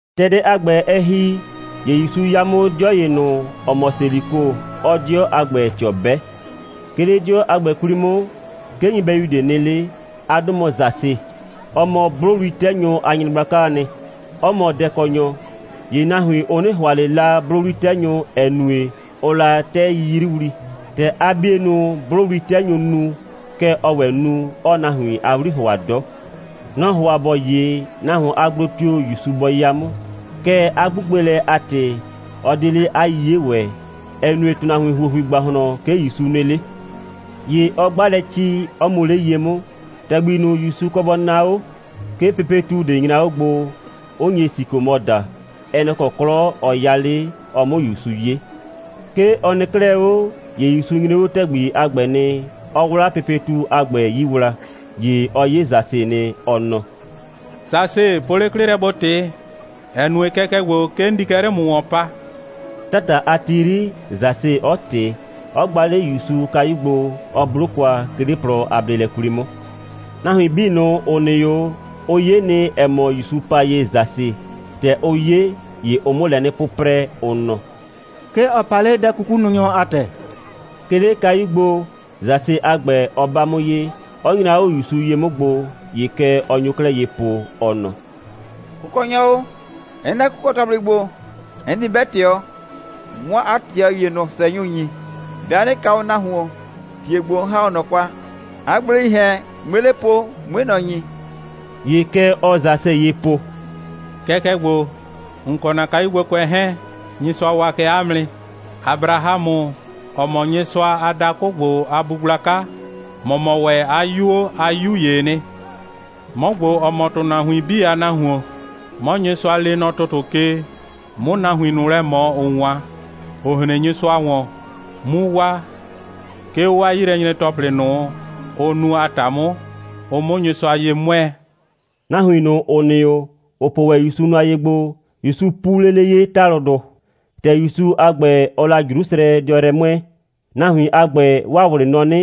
‑Tɛ dɛ a ‑gbɛ, ɛ ‑hi, ‑ye ‑Yusu 'ya 'mʋ 'dɩɔ ‑ye ꞊nʋ, ‑ɔ mɔ Seliko, 'ɔɔ 'dɩɔ a ‑gbɛ ꞊tɩɔ 'bɛ. 'Ke 'le 'dɩɔ a ‑gbɛ 'kwli 'mʋ, 'ke nyɩbɛyu ꞊de nɩ 'le. 'A 'dʋ mɔ Sase. Ɔ mɔ 'blʋwli'tɛnyʋ a nyɩgblakaa nɩ, 'ɔ mɔ dɛkɔnyɔ. (‑Ye nahuin, ʋ 'nɩ ‑hʋa ꞊le la 'blʋwli'tɛnyʋ, ‑ɛ nue, ʋʋ la 'tɛ 'yiyriwli. ‑Tɛ 'a 'bienʋ 'blʋwli'tɛnyʋʋ nu, kɛ ɔɔ ‑wɛ nu, 'ɔɔ nahuin a 'wli ‑hʋa 'dɔ.) Nɔ‑ ‑hʋa ‑bɔ 'ye, nahuon a gblo tio‑ ‑Yusu bɔ 'ya 'mʋ. Kɛɛ, 'a 'gbugbelɛ a ‑tɩ, ɔ 'de 'le 'a 'yiye ‑wɛ, ‑ɛ nue, ‑tʋnahuin ‑huohui ‑gbahlɔn 'ke ‑Yusu nɩ 'le. ‑Ye ɔ 'gba lɛ ci, 'ɔ mu 'le ye 'mʋ, ‑tɛgbi ꞊nʋ, ‑Yusu kɔ bɔ naa 'o. 'Ke pepetu ꞊de nyra 'o gbo, 'ʋ nye sikomɔ daa. Ɛ nɛ‑ kɔ 'klɔ ɔ 'ya 'le, ɔ 'mʋ ‑Yusu 'ye. 'Ke ɔ nɩ 'klɛɛ 'o, ‑ye ‑Yusu nyre 'o ‑tɛgbi a ‑gbɛ nɩ, 'ɔ 'wla pepetu a ‑gbɛ 'yii wla, ‑ye ɔ 'ye Sase nɩ, ɔ nɔ: «Sase, po 'le 'klɩ lɛ, ‑bo ꞊tɩ, ‑ɛ nue, kɛkɛ ‑gbo, 'ke 'n di kɛ 'le ‑mʋ ‑wɔn pa.» 'Tata a ti 'yri, Sase 'ɔ ꞊tɩ, 'ɔ gba 'le ‑Yusu kayu gbo, 'ɔ 'blo kwa, 'ke 'le plɔ a bleelɛ 'kwli 'mʋ. Nahuin 'bii ꞊nʋ, ‑ʋ nɩ 'o, ʋ 'ye nɩ, ‑ɛ mɔ, ‑Yusu pa ye Sase. ‑Tɛ ʋ 'ye, ‑ye ʋʋ 'mʋ lɛ 'nɩ 'pʋprɛ, ʋ nɔ: «'Ke ɔ pa 'le dɛ'kukununyɔ a ‑tɛ.» 'Ke 'le kayu gbo, Sase a ‑gbɛ, ɔ 'ba 'mʋ ye, 'ɔ nyra 'o ‑Yusu ye 'mʋ gbo, ‑ye kɛ ɔ nyo 'klɛɛ ye po, ɔ nɔ: «Kʋkɔnyɔ o, 'n nɛ kʋkɔ‑tɔplɩ ‑gbo, 'n di 'bɛ ꞊tɩɔ, 'mʋ 'a ꞊tɩɔ ‑ye ꞊nʋ ꞊sʋɛnyʋ ‑nyi. 'Bɩa 'nɩ kaa o nahuon, ‑tie ‑gbo, 'n ‑ha 'o ꞊nɔ kwa, 'a gbleii ‑hɛn, 'mue 'le po, 'mue ꞊nɔ ‑nyi.» ‑Ye kɛ ɔɔ Sase ye po: «Kɛkɛ ‑gbo, ‑n kɔ ‑na kayugbokʋɛ 'hɛɛn, Nyɩsʋa waa kɛ 'a mʋ nɩ. Abrahamʋ, ‑ɔ mɔ Nyɩsʋa a dakʋ ‑gbo a bu gblaka, ‑mɔ mɔ ‑wɛ 'a 'yuo a 'yu ‑yee nɩ. 'Mɔ ‑gbo, ‑ɔ mɔ ‑tʋnahuin 'bii a Nahuon, 'mɔ Nyɩsʋa lee nɔ ‑tʋtʋ ke, 'mʋ nahuin ꞊nʋ lɛ ꞊mɔ, ‑ʋ 'wan, ‑ʋ hren Nyɩsʋa ‑wɔn, 'mu waa, 'ke 'o 'waa 'yilɛnyre‑tɔplɩ ꞊nʋ, ʋ nu a ‑ta 'mʋ, ʋ 'mʋ Nyɩsʋa ye 'mʋɛɛ.» Nahuin ꞊nʋ, ‑ʋ nɩ 'o, ‑ʋ po wɛn ‑Yusu nʋa ye gbo, ‑Yusu pu lele ye ‑talʋdʋ. ‑Tɛ ‑Yusu a ‑gbɛ, ɔɔ la Jrusrɛdɩɔ yrɛ 'mʋɛɛ, nahuin a ‑gbɛ, 'waa ꞊wlɩ nɔ 'nɩ,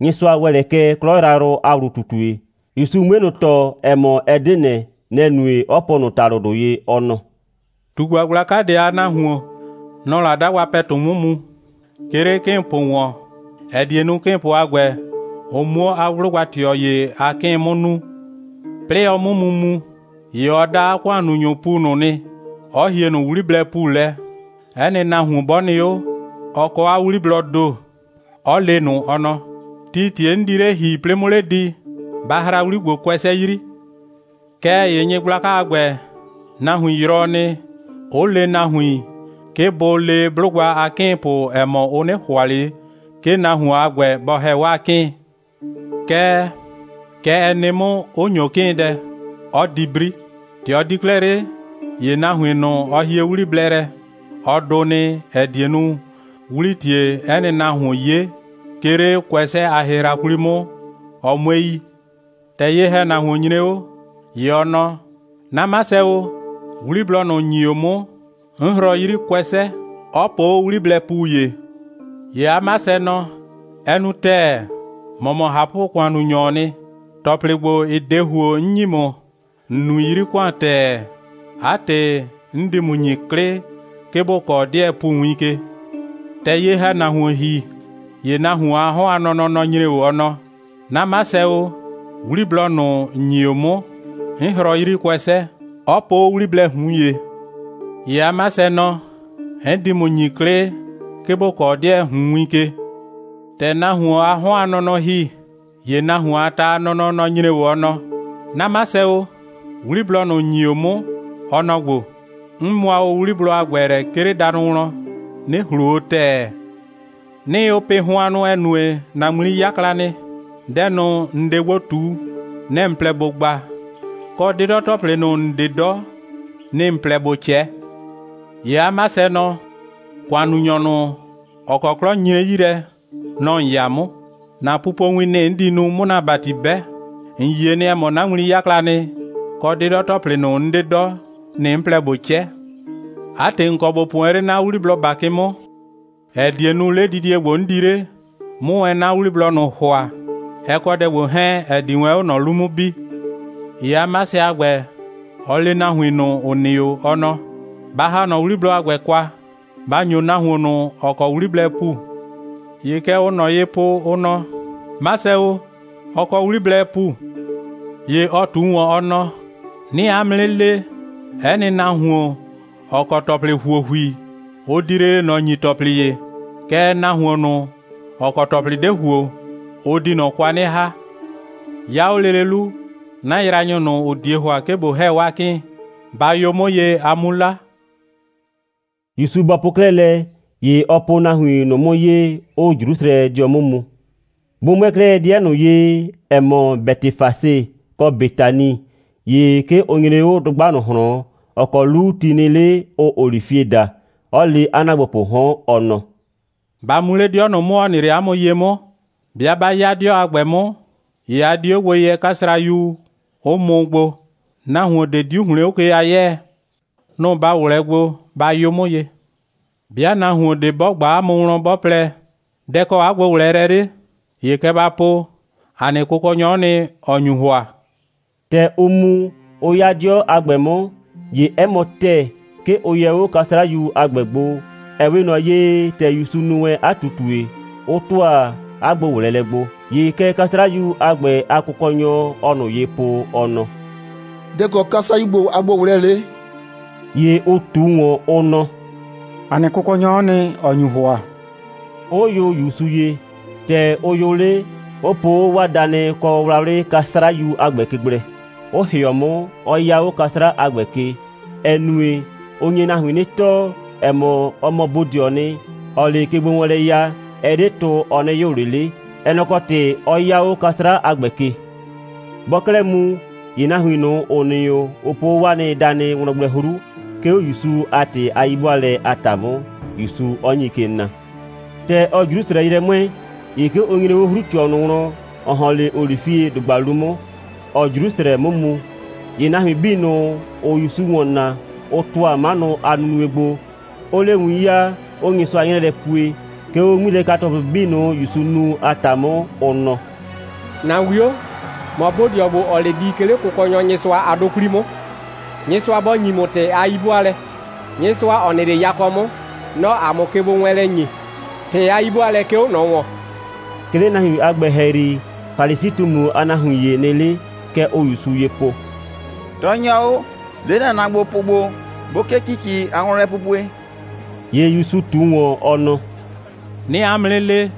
Nyɩsʋa ‑wɛ lɛ kɛ 'klɔ yrayrʋ a ‑wlu꞊tutue. ‑Yusu 'mue ꞊nʋ tɔɔ, ‑ɛ mɔ, ɛ 'de ꞊nɛ, nɛ‑ nue, 'ɔ po ꞊nʋ ‑talʋdʋ ye, ɔ nɔ: «꞊Tugba gblaka ꞊de a nahuon, nɔ‑ɔ la 'dagba ‑pɛtu 'mʋ mu, 'ke 'le 'kɩɩnpʋ ‑wɔn, ‑ɛ die nu, 'kɩɩnpʋ a ‑gbɛ, ʋ 'muo 'a 'blʋgba꞊tɩɔ ‑ye a 'kɩɩn 'mʋ nuu. 'Plɩɩ ɔ 'mʋ mu mu, ‑ye ɔ da 'a ‑kʋannunyʋʋ ‑pu ꞊nʋ nɩ, 'ɔ hie ꞊nʋ 'wliblɛɛ ‑pu lɛ, 'ɛ nɩ nahuon 'bɔ nɩ 'o, ɔ kɔ 'a 'wliblɔɔ ‑do, 'ɔ le ꞊nʋ, ɔ nɔ: Tii ‑tie 'n di 'le ‑hi, 'plɩɩ 'mʋ 'le di, ba hraa 'wli ‑gbo kʋɛsɛ 'yri. Kɛɛ ‑ye nyɩgblaka a ‑gbɛ, nahuin yrɔɔ nɩ, 'ʋ le nahuin, 'ke bʋ le 'blʋgba a 'kɩɩnpʋ, ‑ɛ mɔ, ʋ 'nɩ ‑hʋa ꞊le, 'ke nahuon a ‑gbɛ, bɔ ‑hɛ 'waa 'kɩɩn. Kɛɛ, kɛ ɛ nɩ 'mʋ, 'ʋ ‑nyo 'kɩɩndɛ, 'ɔ di 'bri. ‑Tɛ ɔ di 'klɛɛ 'le, ‑ye nahuin ꞊nʋ, ɔ hie 'wliblɛ lɛ, ɔ dʋ nɩ, ‑ɛ die nu, 'wlii ‑tie 'ɛ nɩ nahuon 'ye, 'ke 'le kʋɛsɛ a hɩhra 'kwli 'mʋ, ɔ 'mue yi. ‑Tɛ ye‑hɛnahuon nyre 'o, ‑ye ɔ nɔ: 'Na 'masɛ o, 'wliblɔ ꞊nʋ, ‑n ‑nyi o 'mʋ, 'n hrɔɔ 'yri kʋɛsɛ, 'ɔ po 'o 'wliblɛɛ ‑pu ‑ye. ‑Ye 'a 'masɛ nɔ: Ɛ nu ‑tɛɛ. ‑Mɔ mɔ ꞊hapʋ‑kʋannunyɔɔ nɩ. ‑Tɔplɩ ‑gbo, ‑ɩ 'de ‑huo, 'n ‑nyi ‑mʋ, ‑n nui 'yri ‑kʋan ‑tɛɛ. 'A ‑tɩ, 'n di ‑mʋ ‑nyi 'klɩ, 'ke ‑bo kɔɔ 'dɩɛɛ ‑pu win ke. ‑Tɛ ye‑hɛnahuon ‑hi, ‑ye nahuon a 'hɔn a nɔnɔ, nɔ‑ nyre 'o, ɔ nɔ: 'Na 'masɛ o, 'wliblɔ ꞊nʋ, ‑n ‑nyi o 'mʋ, 'n hrɔɔ 'yri kʋɛsɛ, 'ɔ po 'o 'wliblɛɛ ꞊hun ‑ye. ‑Ye 'a 'masɛ nɔ: 'N di ‑mʋ ‑nyi 'klɩ, 'ke ‑bo kɔɔ 'dɩɛɛ ꞊hun win ke. ‑Tɛ nahuon a 'hɔn a nɔnɔ ‑hi, ‑ye nahuon a ta a nɔnɔ, nɔ‑ nyre 'o, ɔ nɔ: 'Na 'masɛ o, 'wliblɔ ꞊nʋ, ‑n ‑nyi o 'mʋ, ɔ nɔ‑ ‑gbo. 'N mʋa o 'wliblɔ a ‑gbɛ lɛ, 'ke 'le danʋ wlɔn, 'nɩ ‑hlo o ‑tɛɛ. 'Nɩɩ o pɩ ‑na hʋannʋ, ‑ɛ nue, ‑na ŋmli 'yakla nɩ. Dɛ ꞊nʋ, ‑n 'de gbo ꞊tu, nɛ‑ ‑n plɛ ‑bo gba, kɔ, 'dɩdɔ‑tɔplɩ ꞊nʋ, ‑n 'de 'dɔ, nɩ‑ ‑n plɛ ‑bo 'cɛ. ‑Ye 'a 'masɛ nɔ: ‑Kʋannunyɔ ꞊nʋ, ‑ɔ kɔ 'klɔ nyre 'yi lɛ, nɔ‑ ‑n 'ya 'mʋ. ‑Na pupowin, nɩ‑ 'n di nu, 'mʋ ‑na ‑bati 'bɛ. ‑N yie nɩ, ‑ɛ mɔ, 'na ŋmli 'yakla nɩ, kɔ, 'dɩdɔ‑tɔplɩ ꞊nʋ, 'n 'de 'dɔ, nɩ‑ 'n plɛ ꞊bo 'cɛ. 'A ‑tɩ, ‑n kɔ ‑bo po wɛn 'le 'na 'wliblɔ ‑bakɩ 'mʋ, ‑ɛ die nu, 'ledidie ‑gbo, 'n di 'le, 'mʋ wɛn 'na 'wliblɔ ꞊nʋ ‑hʋa, ɛ kɔ dɛ ‑gbo 'hɛɛn, ‑ɛ di wɛn 'o ꞊nɔ 'lu 'mʋ bi. ‑Ye 'masɛ a ‑gbɛ, ɔ le nahuin ꞊nʋ, ‑ʋ nɩ 'o, ɔ nɔ: Ba ‑ha ꞊nɔ 'wliblɔ a ‑gbɛ kwa, ba ‑nyo nahuon ꞊nʋ, ‑ɔ kɔ 'wliblɛɛ ‑pu. ‑Ye kɛ ʋʋ ꞊nɔ ye po, ʋ nɔ: 'Masɛ o, ɔ kɔ 'wliblɛɛ ‑pu. ‑Ye ɔ ꞊tu ‑wɔn, ɔ nɔ: 'Nɩɩ 'a mʋ 'nɩ le, 'ɛ nɩ nahuon, ‑ɔ kɔ ‑tɔplɩ ‑huohui, ʋ di lele ꞊nɔ ‑nyi ‑tɔplɩ ‑ye. Kɛɛ, nahuon ꞊nʋ, ‑ɔ kɔ ‑tɔplɩ 'de ‑huo, ʋ di ꞊nɔ kwa 'nɩ ‑ha. 'Ya 'o lele 'lu, 'na yraanyʋ ꞊nʋ, ‑ʋ 'die ‑hʋa, 'ke ꞊bo ‑hɛ 'waa 'kɩɩn, ba yʋ 'mʋ ye, a 'mu 'la.» ‑Yusu bɔ po 'klɛɛ lɛ, ‑ye ɔ po nahuin ꞊nʋ 'mʋ ye, 'ʋʋ Jrusrɛdɩɔ 'mʋ mu. Bʋ 'mʋɛɛ 'klɛɛ 'dɩɛ ꞊nʋ ye, ‑ɛ mɔ, Bɛtɩfase kɔ Betani, ‑ye 'ke ʋ nyre 'o dʋgba ꞊nʋ ꞊hlɔn, ‑ɔ kɔ 'lu ti nɩ 'le, ʋʋ olifie daa, 'ɔ le 'a ‑naagbopʋʋ 'hɔn, ɔ nɔ: «Ba mu 'le 'dɩɔ ꞊nʋ 'mʋ, ‑ɔ nɩ 'le 'a mʋ ye 'mʋ. 'Bɩa 'ba 'ya 'dɩɔ a ‑gbɛ 'mʋ, ‑ye a di 'o gbo yɛ 'kasrayu, 'ʋ mʋ gbo. Nahuon ꞊de 'diu ‑hlɩn 'o ke a 'yɛɛ. Nʋ‑ ba ꞊wlɛɛ gbo, ba yʋ 'mʋ ye. 'Bɩa nahuon ꞊de 'bɔ ꞊gba 'a mʋ wlɔn, 'bɔ plɛ: Dɛ‑ kɔ 'a gbo꞊wlɛɛlɛ 'le? ‑ye kɛ ba po: ‑A nɩ Kʋkɔnyɔ'ɔ nɩ, ‑ɔ nyu ‑hʋa.» ‑Tɛ ʋ mu, ʋ 'ya 'dɩɔ a ‑gbɛ 'mʋ, ‑ye 'ɛ mɔ ‑tɛɛ, 'ke ʋ yɛ 'o 'kasrayu a ‑gbɛ gbo, ‑ɛ 'we ꞊nɔ ye, ‑tɛ ‑Yusu nu wɛn 'a ꞊tutue, 'ʋ ‑tʋa 'a gbo꞊wlɛɛlɛ gbo. ‑Ye kɛ 'kasrayu a ‑gbɛ a kʋkɔnyʋ, ʋʋ ꞊nʋ ye po, ʋ nɔ: «Dɛ‑ kɔ 'kasrayu ‑gbo a gbo꞊wlɛɛlɛ 'le?» ‑Ye ʋ ꞊tu ‑wɔn, ʋ nɔ: «‑A nɩ Kʋkɔnyɔ'ɔ nɩ, ‑ɔ nyu ‑hʋa,» 'ʋ yʋ ‑Yusu ye. ‑Tɛ ʋ yʋ 'le, 'ʋ po 'o 'waa danɩ kɔ wlawlɩ 'kasrayu a ‑gbɛ ke gblɛ, 'ʋ ‑hɩɔ 'mʋ, 'ɔ 'ya 'o 'kasrayu a ‑gbɛ ke. (‑Ɛ nue, ɔ nye nahuin 'nɩ tɔɔ, ‑ɛ mɔ, ɔ mɔ bodɩɔɔ nɩ, ‑ɔɔ 'le kegbowɛɛnlɛ ya, ɛ 'de tʋ, ɔ 'nɩ yʋ ꞊le 'le. Ɛ nɛ‑ kɔ ‑tɩ 'ɔ 'ya 'o 'kasra a ‑gbɛ ke.) Bɔɔ 'klɛɛ mu, ‑ye nahuin ꞊nʋ, ‑ʋ nɩ 'o, ʋ po 'o 'waa nɩ danɩ wlɔn gblɛ 'hru, 'ke 'o ‑Yusu a ‑tɩ a 'yi'bʋaalɛ a ‑ta 'mʋ, ‑Yusu 'ɔ nyi ke na. ‑Tɛ ɔɔ Jrusrɛ yrɛ 'mʋɛɛ, ‑ye 'ke ʋ nyre 'o 'hru꞊tɩɔ ꞊nʋ wlɔn, ‑ɔ ‑hɔn 'le olifiedʋgba 'lu 'mʋ, ‑ɔɔ Jrusrɛ 'mʋ mu. ‑Ye nahuin 'bii ꞊nʋ, ‑ʋʋ ‑Yusu ‑wɔn naa, ʋ ‑tʋa 'manʋ a nunue gbo, 'ʋʋ 'le win 'yaa, 'ʋʋ Nyɩsʋa 'nyrɛɛ lɛ pue, 'ke 'o 'ŋmilɛka‑tɔplɩ 'bii ꞊nʋ, ‑Yusu nu a ‑ta 'mʋ, ʋ nɔ: «‑Na 'wio, ‑mɔ bodɩɔ ‑gbo, ‑ɔɔ 'le di, 'ke 'le Kʋkɔnyɔ Nyɩsʋa a 'dʋ 'kwli 'mʋ, Nyɩsʋa bɔ ‑nyi ‑mʋ ‑tɩ a 'yi'bʋaalɛ. Nyɩsʋa, ‑ɔ nɩ 'le yakɔ 'mʋ, nɔ‑ɔ ‑a mʋ kegbowɛɛnlɛ ‑nyi. ‑Tɩ a 'yi'bʋaalɛ, 'ke 'o ꞊nɔ ‑wɔn.» 'Ke 'le nahuin a ‑gbɛ ‑hɛyri, Falisi꞊tumu a nahuin ‑ye nɩ 'le. Kɛ ʋʋ ‑Yusu ye po: «Tɔɔnyɔ o, le ‑na ‑naagbopʋ ‑gbo, bʋ 'kee ‑cici a wlɔnlɛpupue!» ‑Ye ‑Yusu ꞊tu ‑wɔn, ɔ nɔ: «'Nɩɩ 'a mʋ 'nɩ le,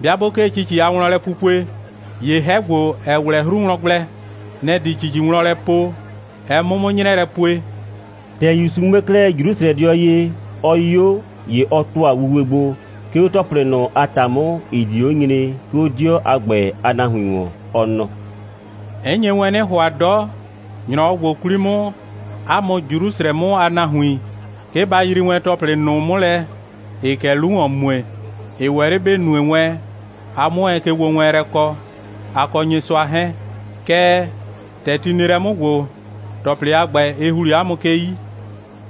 'bɩa 'bʋ 'kee ‑cici a wlɔnlɛpupue, ‑ye 'hɛ ‑gbo, ‑ɛ 'wlɛ 'hru wlɔn gblɛ, nɛ‑ di ‑cici wlɔn lɛ po, ɛ 'mʋ 'mʋ 'nyrɛɛ lɛ pue.» ‑Tɛ ‑Yusu 'mʋɛɛ 'klɛɛ Jrusrɛdɩɔ ye, ɔ 'yo, ‑ye ɔ ‑tʋa wuwe gbo, 'ke 'o ‑tɔplɩ ꞊nʋ a ‑ta 'mʋ, ‑ɩ di 'o nyre, 'ke 'o 'dɩɔ a ‑gbɛ a nahuin ‑wɔn, ɔ nɔ: «'N nye wɛn 'nɩ ‑hʋa 'dɔ, ‑nyrɔwɔ ‑gbo 'kwli 'mʋ, 'a mʋ Jrusrɛ 'mʋ a nahuin, 'ke ba yrii wɛn ‑wɛ ‑tɔplɩ ꞊nʋ 'mʋ lɛ, ‑ɩɩ kɛ 'lu ‑wɔn mue, ‑ɩ ‑wɛ 'le ‑bɩ nue wɛn, a 'mʋ wɛn kegbowɛɛnlɛ kɔ, a kɔ Nyɩsʋa 'hɛɛn. Kɛɛ, ‑tɛ ti nɩ lɛ 'mʋ ‑gbo, ‑tɔplɩ a ‑gbɛ, ɩ ‑hli 'a mʋ ke 'yi.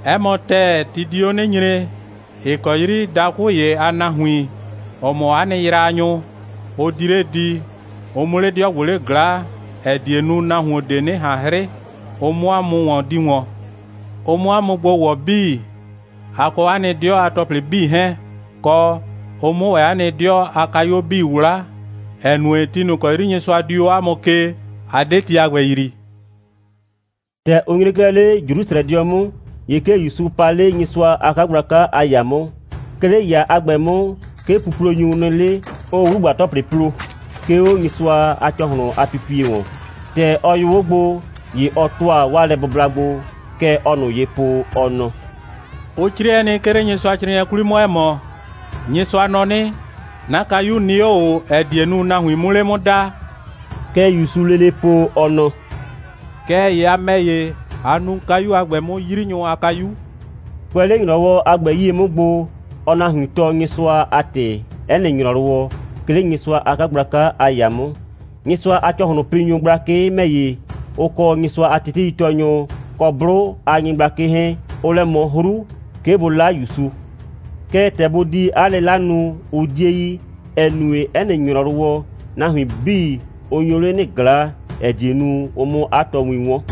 'Ɛ mɔ ‑tɛɛ, ti di 'o 'nɩ nyre, ‑ɩ kɔ 'yri dakʋ ‑ye a nahuin, ‑ʋ mɔ 'a nɩ yraanyʋ, ʋ di 'le di, ʋ 'mʋ 'le 'dɩɔ ‑gbo 'le ꞊glaa, ‑ɛ die nu, nahuon ꞊de 'nɩ ꞊han 'hrɩ, ʋ 'mʋ 'a mʋ ‑wɔn di ‑wɔn, ʋ 'mʋ 'a mʋ gbo ‑wɔ 'bii, a kɔ 'a nɩ 'dɩɔ a ‑tɔplɩ 'bii 'hɛɛn, kɔ, ʋ 'mʋ ‑wɛ 'a nɩ 'dɩɔ a kayuo 'bii 'wla, ‑ɛ nue, ti ꞊nʋ ‑kɔ 'yri Nyɩsʋa dii 'a mʋ ke, a 'de ti a ‑gbɛ yrii.» ‑Tɛ ʋ nyre 'klɛɛ 'le Jrusrɛdɩɔ 'mʋ, ‑ye 'ke ‑Yusu pa 'le Nyɩsʋa a 'kagblaka a ‑yaa 'mʋ. 'Ke 'le ‑yaa a ‑gbɛ 'mʋ, 'ke puplonyʋ nɩ 'le, 'ʋʋ 'wlugba‑tɔplɩ plo, 'ke 'o Nyɩsʋa a ‑cɔhlʋn a pipie ‑wɔn. ‑Tɛ ɔ yʋ 'o gbo, ‑ye ɔ ‑tʋa 'waa lɛbʋbla gbo. Kɛ ɔɔ ꞊nʋ ye po, ɔ nɔ: «Ʋ 'crɩɛ nɩ, 'ke 'le Nyɩsʋacrɩɩnɩɛ 'kwli 'mʋ, ‑ɛ mɔ: Nyɩsʋa nɔ 'nɩ: 'Na kayu nɩ 'o ꞊o, ‑ɛ die nu, nahuin 'mʋ 'le 'mʋ daa.» Kɛ ‑Yusuu lele po, ɔ nɔ: «Kɛɛ ‑ye a ‑mɛ ‑ye, a nuu kayu a ‑gbɛ 'mʋ 'yrinyʋ a kayu.» Kʋɛ 'le ‑nyrɔwɔ a ‑gbɛ 'yie 'mʋ gbo, ɔɔ nahuin tɔɔ Nyɩsʋa a ‑tɩ 'ɛ nɩ ‑nyrɔwɔ, 'ke 'le Nyɩsʋa a 'kagblaka a ‑yaa 'mʋ. Nyɩsʋa a ‑cɔhlʋnpinyʋ gblakɩ ‑mɛ ‑ye, ʋ kɔ Nyɩsʋa teteitɔɔnyʋ, kɔ 'blʋ a nyɩgblakɩ 'hɛɛn, ʋʋ lɛ ꞊mɔ 'hru, 'ke bʋ 'la ‑Yusu. Kɛɛ, ‑tɛ bʋ di 'a 'lɩla nu, ʋ 'die yi, ‑ɛ nue, 'ɛ nɩ ‑nyrɔwɔ, nahuin 'bii, ʋ nyo 'le 'nɩ ꞊glaa, ‑ɛ die nu, ʋ 'mʋ 'a tɔɔwin 'wɔn.